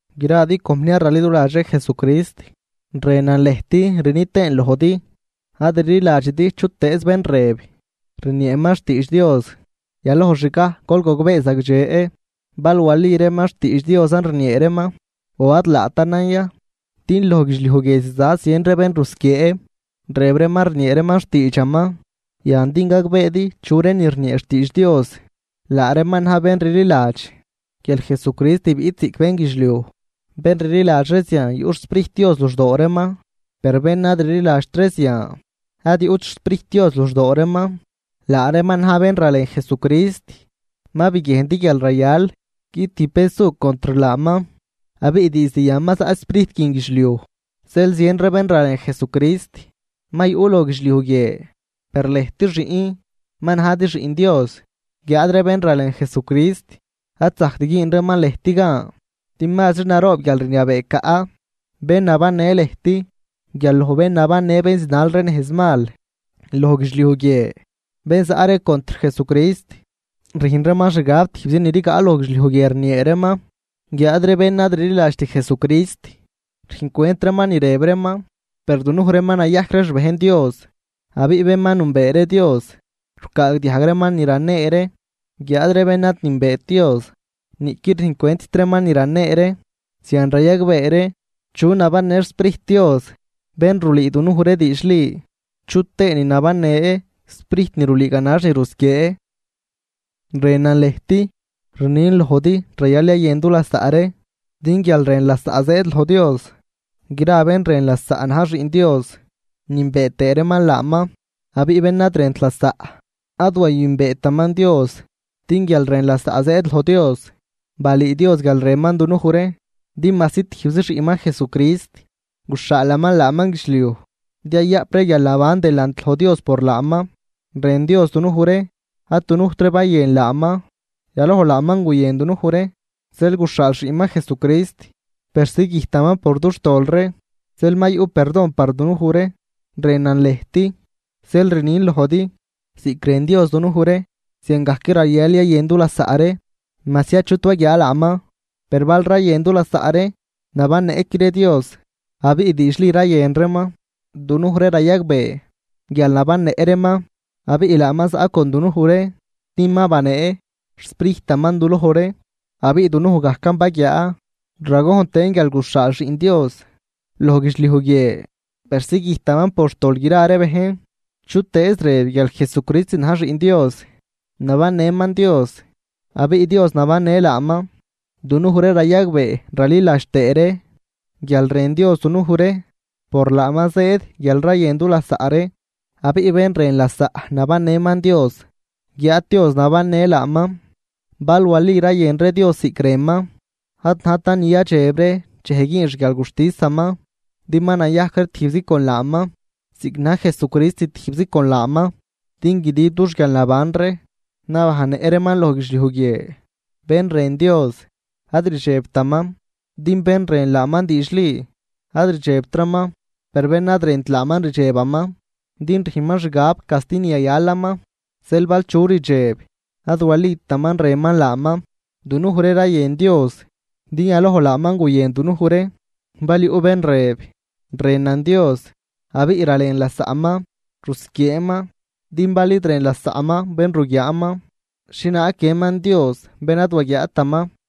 Gradi compniar raliduladx ree Jesucrist, rënan lëjt, rni tëën lojdi: ad rliladxidi chutëëz bén rëb rnieeman xtiidx Dios. Yaloj xgaj gol gogbee zagdxe bal wali reeman xtiidx Diosan rniee reeman o ad laatanan ya, din loj guidxliuj guie ziza zien ree bén rusquiee, rëb reeman rniee reeman xtiidxaman. Yan din gagbeedi chu reenin rniee xtiidx Dios: Laa reeman na̱j bén rliladx guial Jesucrist biꞌt ziꞌc bénguidxliuj. Bén rliladx ree zian yuꞌ xSprijt Dios luxdoo reeman. Per bén ad rliladxt ree zian ad yuꞌt xSprijtaman luxdoo reeman, laa reeman na̱j bén ralen Jesucrist. Ma biguiejndi guial rayal guiꞌt tijb bén su contr laaman. Abiꞌ diizd yan ma zaꞌ sprijt guin guidxliuj, zeel zien ree bén ralen Jesucrist ma yuꞌ loj guidxliuj guie. Per lëjt xiꞌn ma najdi xiꞌn Dios, guiáad ree bén ralen Jesucrist ad zajct güün reeman lëjt gan, din mazri naroob guialrniabee caꞌ bén nabannë lëjt guial loj bén nabannë bén zinal ree nejz mal loj guidxliuj guie. Bén zaꞌ ree contr Jesucrist rüjn reeman xgab tijbzi ni rigaꞌ loj guidxliuj guie rniee reeman, guiáad ree bén ad rliladxt Jesucrist rüjncwent reeman ni rëb reeman. Per dunuj ree ma nayajc ree xbejn Dios, abiꞌ bén ma nünbee ree Dios rucaagdiajg reeman ni ranee ree, guiáad ree bén ad nünbeet Dios niꞌquid rüjncwentt reeman ni ranee ree, zian rayagbee ree chu nabannë xSprijt Dios bén rulüü dunuj ree diidxli chutëënin nabannë sprijt ni rulüü ganax ni rusquiee. Rënan lëjt, rnin lojdi rayal yayën dulasaꞌ ree, din guialrën lasaꞌ zëëd loj Dios. Gra bén rën lasaꞌ na̱j xiꞌn Dios nünbee tëë reeman laaman. Abiꞌ bén ad rënt lasaꞌ ad wayünbeetaman Dios, din guialrën lasaꞌ zëëd loj Dios. Balüü Dios guial rënman dunuj ree, din majsi tijbzi xiꞌnman Jesucrist, guxhaalaman laaman guidxliuj din yayaꞌp ree guialnaban delant loj Dios por laaman. Rën Dios dunuj ree. Ad dunujt ree bayën laaman, yaloj laaman guyën dunuj ree, zeel guxhaal xiꞌnman Jesucrist persi güjtaman por dux tol ree, zeel ma yuꞌ perdon par dunuj ree. Rënan lëjt, zeel rnin lojdi, ziꞌc rën Dios dunuj ree, ziangajc rayal yayën dulasaꞌ ree. Majsi achut waguiaa laaman, per bal rayën dulasaꞌ ree, nabannëꞌqui ree Dios, abiꞌ diidxli rayën reeman. Dunuj ree rayagbee guial nabannëꞌ reeman abiꞌ laaman zaꞌ con dunuj ree, din ma banee xSprijtaman duloj ree. Abiꞌ dunuj gajcan baguiaa ragojn tëën guial guxhaal Xiꞌn Dios loj guidxliuj guie persi güjtaman por xtol gra ree bejn. Chutëëz rëb guial Jesucrist na̱j Xiꞌn Dios nabannëman Dios, abiꞌ Dios nabannë laaman. Dunuj ree rayagbee raliladx tëë ree guial rën Dios dunuj ree. Por laaman zëëd guial rayën dulasaꞌ ree. Abiꞌ bén rën lasaꞌ nabannëman Dios, guiáad Dios nabannë laaman. Bal wali rayën ree Dios ziꞌc rënman, ad najtan ni yadxeb ree dxej güün xguialguxtisaman, din ma nayajc ree tijbzi con laaman, ziꞌc na̱j Jesucrist tijbzi con laaman. Din guidib dux guialnaban ree nabannëꞌ reeman loj guidxliuj guie. Bén rën Dios, ad rdxebtaman, din bén rën laaman diidxli, ad rdxebtraman, per bén ad rënt laaman rdxebaman, din rüjnman xgab casti ni yayalaman, zeel bal chu rdxeb, ad walitaman rënman laaman. Dunuj ree rayën Dios, din yaloj laaman guyën dunuj ree. Bal yuꞌ bén rëb: “Rënan Dios”, abiꞌ ralen lasaꞌman, rusquieeman. Din bal id rën lasaꞌman bén ruguiaaman, ¿xhienaag guiënman Dios bén ad waguiaataman?